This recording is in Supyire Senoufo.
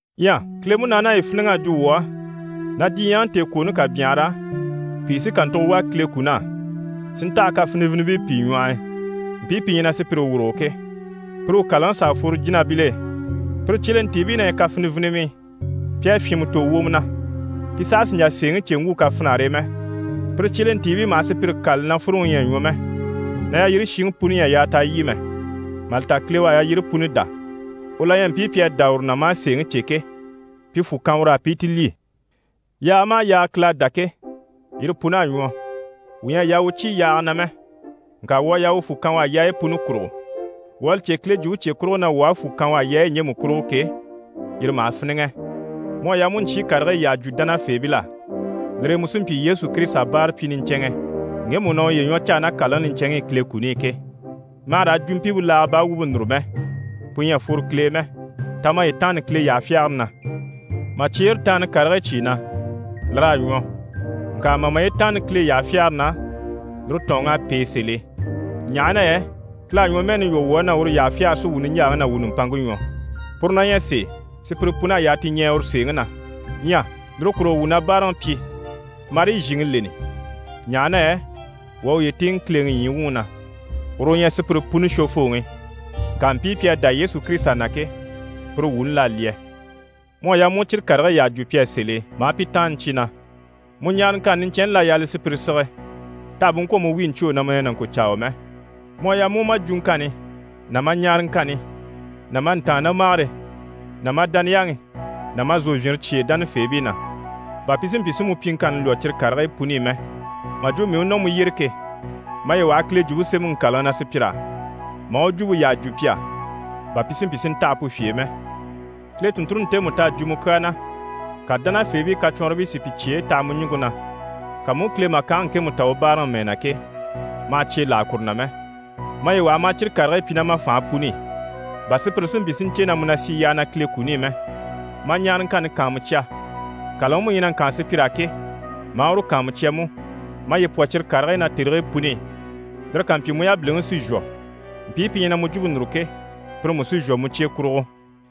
Ɲyɛ Kile Munaani à yi fíniŋ'a jwo wuu á na diɲyɛŋi tèekwooni ká byanhara, pìi sí kàntugo wà Kile kun'á, si ntaha kafinivinibii pìi ɲwɔh'i, mpii pi ɲyɛ na sùpyire wurugo ke, pire u kàlaŋi s'à fworo jínabil'e. Pire cyelentiibii na ɲyɛ kafinivinimii, pi à fyìnmɛ tò wwomɔ na, pi saha sì n‑jà sèeŋi cè n‑wwû kafinare e mɛ. Pire cyelentiibii maha sùpyire kâlali na fúruŋi ɲyɛ a ɲwɔ mɛ, na yalyire shiŋi puni ɲyɛ a yaa t'a lyî mɛ, mà li ta Kile u à yalyire puni dá. U la ɲyɛ mpii pi à dá uru na maa sèeŋi cè ke, pi fwù kan ur'á pi i ti lyî. Yaaga maha yaaga Kile à dá ke, yire pun'à ɲwɔ, wuu ɲyɛ a yaa wuu cyé yaaga na mɛ, ŋka wuu à yaa wuu fwù kan u á yaayi puni kurugo. Wuu à li cè Kile Jwumpe cye kurugo na wuu aha fwù kan u á yaayi ɲjemu kurugo ke, yire maha fíniŋɛ. Mu à yaa mu u ɲcyii karigii yyaha jwo dánafeebil'á, lire e mu sí n‑pyi Yesu Kirisita báarapyi niɲcɛnŋɛ ŋgemu u na uye ɲwɔ caa ná kàlaŋi niɲcɛnŋi i Kile kuni i ke. Ma hà raa jwuɲjyempe laaga baa wumpe núru mɛ, pu ɲyɛ a fworo Kile e mɛ. Ta maye taanni Kile yyaha fyagare na. Mà cyeere taanna karigii cyìi na, lir'à ɲwɔ, ŋka mà maye taanna Kile yyaha fyagare na, lire tɔ̀ɔnŋ'à pêe sèl'e ɲaha na yɛ Kile à ɲwɔmɛɛni lwɔ́ wuu á na uru yyaha fyagare sí wuu niɲjaaŋi ná wuu nùmpanŋke ɲwɔ. Puru na ɲyɛ sèe, sùpyire pun'à yaa ti ɲɛɛ uru sèeŋi na. Ɲyɛ lire kurugo wuu na báaraŋi pyi, marii zhìŋi leni, ɲaha na yɛ wuu à wuye tíiŋɛ Kileŋi ɲyii wuŋi na, uru u ɲyɛ sùpyire puni Shwofooŋi, ŋka mpii pi à dá Yesu Kirisita na ke, pire wuuni l'à lyɛ. Mu à yaa mu u cyire karigii yyaha jwo pi á sèl'e maa pi taanna cyi na. Mu ɲaaraŋkanni niɲcɛnni l'à yaa li sùpyire sige t'àha bú ŋkwɔ̀ mu wíi ɲcwô na mu na ɲyɛ nàŋkocyaawa mɛ. Mu a yaa mu u ma jwuŋkanni ná ma ɲaaraŋkanni ná ma ntàannamagare ná ma dániyaŋi ná ma zòvyinre cyêe dánafeebii na, bà pi si mpyi si mu pyiŋkanni lwɔ́ cyire karigii puni i mɛ. Mà jwo mii u nɔ mu yyére ke, maye waha Kile Jwumpe Semɛŋi ŋkàlaŋi na sùpyir'á, maa u jwumpe yyaha jwo pi á, bà pi si mpyi si ntaha pu fye e mɛ. Kile tùnnture ntemu t'à jwo mu kyaa na, ka dánafeebii kacwɔnribii si pi cyeyi taha mu ɲùŋke na, ka mu u Kile màkange ŋkemu ta u báaraŋi mɛɛ na ke, ma hà cye láha kuru na mɛ. Maye waha maa cyire karigii pyi ná ma fànhe puni i, bà sùpyire si mpyi si ɲcè na mu na sì yyaha na Kile kuni i mɛ. Ma ɲaaraŋkanni kàanmucya. Kàlaŋi mu ɲyɛ na ŋkaan sùpyir'á ke, maa uru kàanmucya mú. Maye pwɔ cyire karigii na tèrigii puni i. Lire ká mpyi, mu yabiliŋi sí n‑shwɔ, mpii pi ɲyɛ na mu jwumpe núru ke, pire mú sí n‑shwɔ mu cye kurugo.